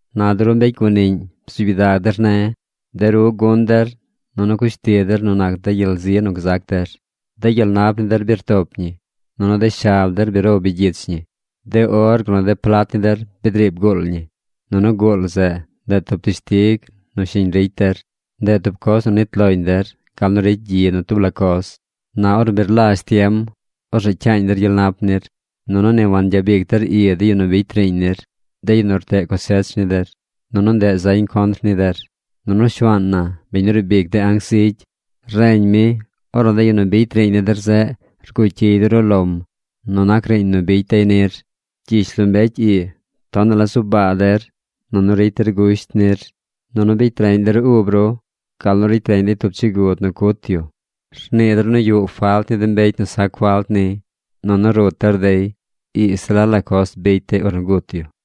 ¡Na de ru mbecy guaniꞌñ bzuub gyidag der ne̱! ¡De ru gun der, nunu cush ti der nu nac de gyel zi nu gzac der! De gyel nap ni der bi rtop ñi, nunu de shab der bi row bigyich ñi. De or gal nu de plat ni der bi driib guul ñi. Nunu guul zeꞌ, ndeꞌ tub teshtig nu shiñ ricy der. Ndeꞌ tub coz nu nit loñ der gal nu ricy gyi nu tub la coz. Na ornu bi rlazh tiem, orzeꞌ cyaañ der gyel nap nir. Nunu ni wangyabic der i de yu nu bicy riiñ nir, de yu nu rteꞌ cosech ni der. Nunu ndeꞌ zañ contr ni der. Nunu Shuaan na, biñ nu riib ic de anc zigy, reñ mi ornu de yu nu bicy riiñ ni der zeꞌ rguꞌ cyiy de ru lom nu nac riiñ nu bicy dey nir. Gyishlombecy ii tonaꞌ la zu baa der nunu ricy der gusht nir. Nunu bicy reꞌñ der ub ru gal nu ricy reꞌñ dey tub chigud nu cut yu. Rnii der nu yuꞌ falt ni de mbecy nu sac falt ni, nunu rut der dey. Ii se la la coz bicy dey ornu gut yu.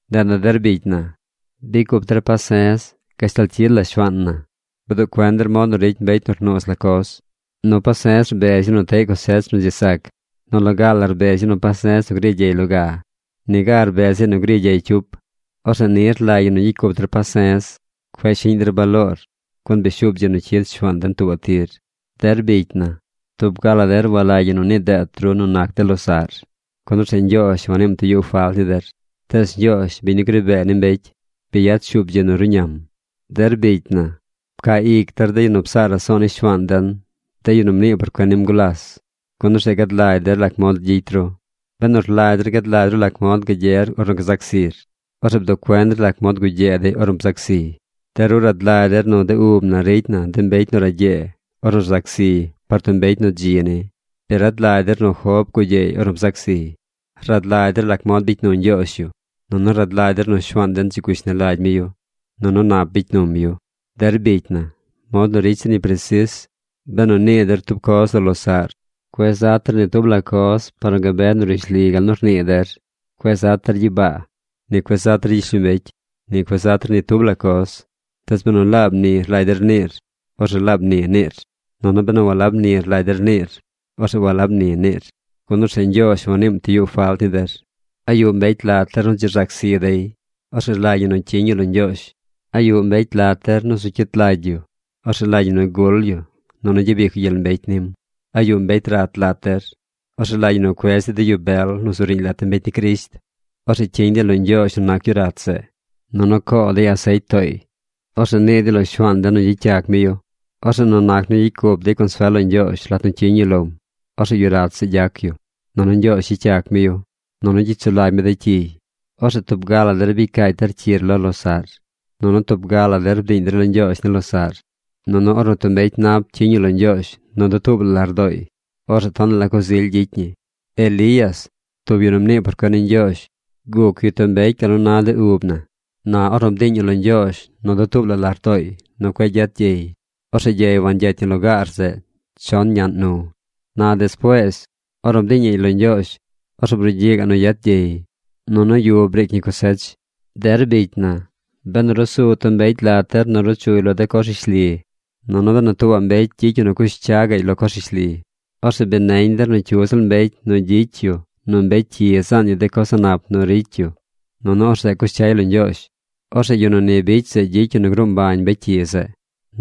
Ndeꞌ nu der bicy na, bicy cup der pase̱z gashtal cyid la Shuaan na. Bduꞌ cuen der mod nu ricy mbecy nu rnuuz la coz. Nu pase̱z rbez yu nu teꞌy cosech nu dzi sac. Nu loga la rbez yu nu pase̱z nu gri gyey loga. Niga rbezaꞌy nu gri gyey cyup. Orzeꞌ ni rlagy ñi nu gyicy cup der pase̱z. Cueꞌ shiꞌñ der baloor, gun bi shuub dzi nu cyid Shuaan den tuubaꞌ tir. Der bicy na, tub ga la der walagy ñi nu nii deet ru nu nac de losaꞌr, gun orzeꞌ Ñgyoozh waniim ti yuꞌ falt ni der. Tees Ñgyoozh, biñ nu gri bee ni mbecy, bi yad shuub dzi nu ruꞌñam. Der bicy na, pcaa ic der de yu nu psaa raso̱o̱ ni Shuaan den, de yu nu mnii por cuen nim gulas, gun orzeꞌ gad lagy der lac mod gyicy ru. Benu rlagy der gad lagy ru lac mod gagyer ornu gzac zir, orzeꞌ bduꞌ cuen der lac mod gugyee dey ornu bzac ziy. De ru rad lagy der nu de ub na ricy na de mbecy nu ragyee ornu rzac zi par tub mbecy nu dzi ni. Bi rad lagy der nu Job gugyeey ornu bzac ziy. Rad lagy der lac mod bicy nu Ñgyoozh yu. Nunu rad lagy der nu Shuaan den dzi gushni lagy mi yu. Nunu nap bicy num yu. Der bicy na, mod nu ricy zir ñi presis, benu nii der tub coz lo losaꞌr, cueꞌ zat der ni tub la coz par nu gabe nu rishli gal nu rnii der. Cueꞌ zat der gyibaa. Ni cueꞌ zat der gyishlombecy. Ni cueꞌ zat der ni tub la coz. Tees benu laab ni rlagy der niir, orzeꞌ laab ni niir. Nunu benu walab ni rlagy der niir, orzeꞌ walab ni niir. Gun orzeꞌ Ñgyoozh waniim ti yuꞌ falt ni der. ¿A yuꞌ mbecy lat der nu dzi rzac zi dey? Orzeꞌ rlagy ñi nu cyiñ yu lo Ñgyoozh. ¿A yuꞌ mbecy lat der nu zu cyit lagy yu? Orzeꞌ rlagy ñi nu gul yu nunu gyabicy yu gyel mbecy nim. ¿A yuꞌ mbecy rat lat der? Orzeꞌ rlagy ñi nu cuedz dey de yu bel nu zu riiñ lat de mbecy ni Crisht. Orzeꞌ cyiñ dey lo Ñgyoozh nu nac yu rat zeꞌ. Nunu coo dey asecy tooy. Orzeꞌ nii dey lo Shuaan den nu gyicy yac mi yu. Orzeꞌ nu nac nu gyicy cup dey consuel lo Ñgyoozh lat nu cyiñ yu lom, orzeꞌ yu rat zeꞌ gyac yu. Nunu Ñgyoozh gyicy yac mi yu. Nunu gyicy sulagy mi de cyiy. Orzeꞌ tub ga la der bicy caacy der cyir lo losaꞌr. Nunu tub ga la der bdiiñ der lo Ñgyoozh ni losaꞌr. Nunu ornu tub mbecy nap cyiñ yu lo Ñgyoozh nu dutuub la lardooy, orzeꞌ tonaꞌ la coz ily gyicy ñi. Elías, tub yu nu mnii por cuen ni Ñgyoozh, guc yu tub mbecy gal nu na de ub na. Na ornu bdiiñ yu lo Ñgyoozh nu dutuub la lardooy nu cueꞌ gyet gyey, orzeꞌ gyey wangyet ñi lugaar zeꞌ chon ñaꞌn nu. Na despuees ornu bdiiñaꞌy lo Ñgyoozh, orzeꞌ brugyiꞌ gaꞌ nu yet gyey, nunu yu briic ñi cosech. Der bicy na, benu rusu tub mbecy lat der nu ruu chuy lo de coz rishli, nunu benu tuubaꞌ mbecy gyicy yu nu cush cya gaꞌy lo coz rishli, orzeꞌ bi neñ der nu cyu ziꞌl mbecy nu gyicy yu nu mbecy cyi zaan yu de coz a̱ꞌ nap nu ricy yu, nunu orzeꞌ cush cyay lo Ñgyoozh, orzeꞌ yu nu ni bicy zeꞌ gyicy yu nu gruu mbañ mbecy cyi zeꞌ,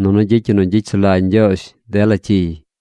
nunu gyicy yu nu gyicy sulagy Ñgyoozh dela cyiy.